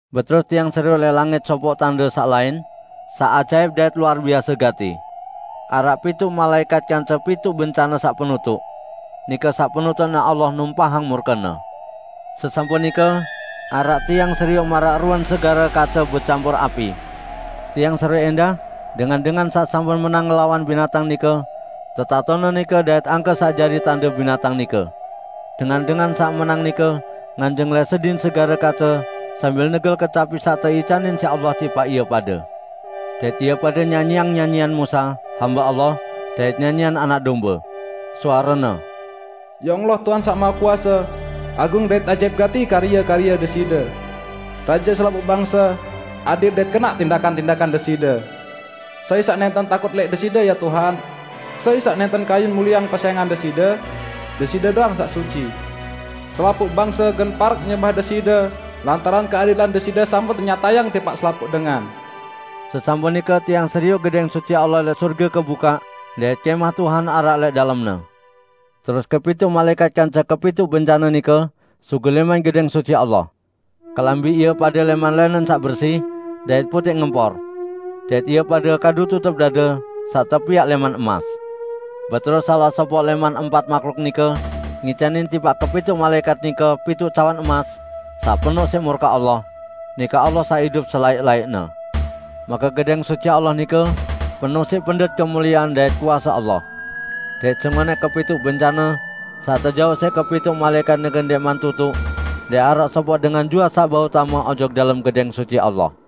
Beterus tiang serioq lẽq langit sopoq tande saq lain, saq ajaip dait luar biase gati. Araq pituq malaẽkat kance pituq bencane saq penutuq. Nike saq penutuqne Allah numpahang murke-Ne. Sesampun nike, araq tiang serioq maraq ruen segare kace becampur api. Tiang serioq ẽndah dengan-dengan saq sampun menang ngelawan binatang nike, tetatone nike dait angke saq jari tande binatang nike. Dengan-dengan saq menang nike nganjeng lẽq sedin segare kace sambil negel kecapi saq teicanin siq Allah tipaq ie pade. Dait ie pade nyanyiang nyanyian Musa, hambe Allah, dait nyanyian Anak Dombe. Suarene: "Ya Allah, Tuhan Saq Mahekuase, agung dait ajaip gati karye-karye Deside! Raje selapuq bangse, adil dait kenaq tindakan-tindakan Deside! Sai saq nẽnten takut lẽq Deside, ya Tuhan? Sai saq nẽnten kayun mulieang pesẽngan Deside? Deside doang saq suci. Selapuq bangse gen parek nyembah Deside lantaran keadilan Deside sampun tenyatayang tipaq selapuq dengan." Sesampun nike tiang serioq Gedẽng Suci Allah lẽq sorge kebukaq, dait Kẽmah Tuhan araq lẽq dalemne. Terus kepituq malaẽkat kance kepituq bencane nike sugul lẽman Gedẽng Suci Allah. Kelambi ie pade lẽman lẽnen saq bersi dait putẽq ngempor. Dait ie pade kadu tutup dade saq tepiaq lẽman emas. Beterus salaq sopoq lẽman empat mahluk nike ngicanin tipaq kepituq malaẽkat nike pituq cawan emas saq penoq siq murke Allah, -- nike Allah saq idup selaẽq-laẽqne. Make Gedẽng Suci Allah nike penoq siq pendet kemuliean dait kuase Allah. Dait sengonẽq kepituq bencane saq tejauq siq kepituq malaẽkat nike ndẽqman tutuq, ndẽq araq sopoq dengan juaq saq bau tame ojok dalem Gedẽng Suci Allah.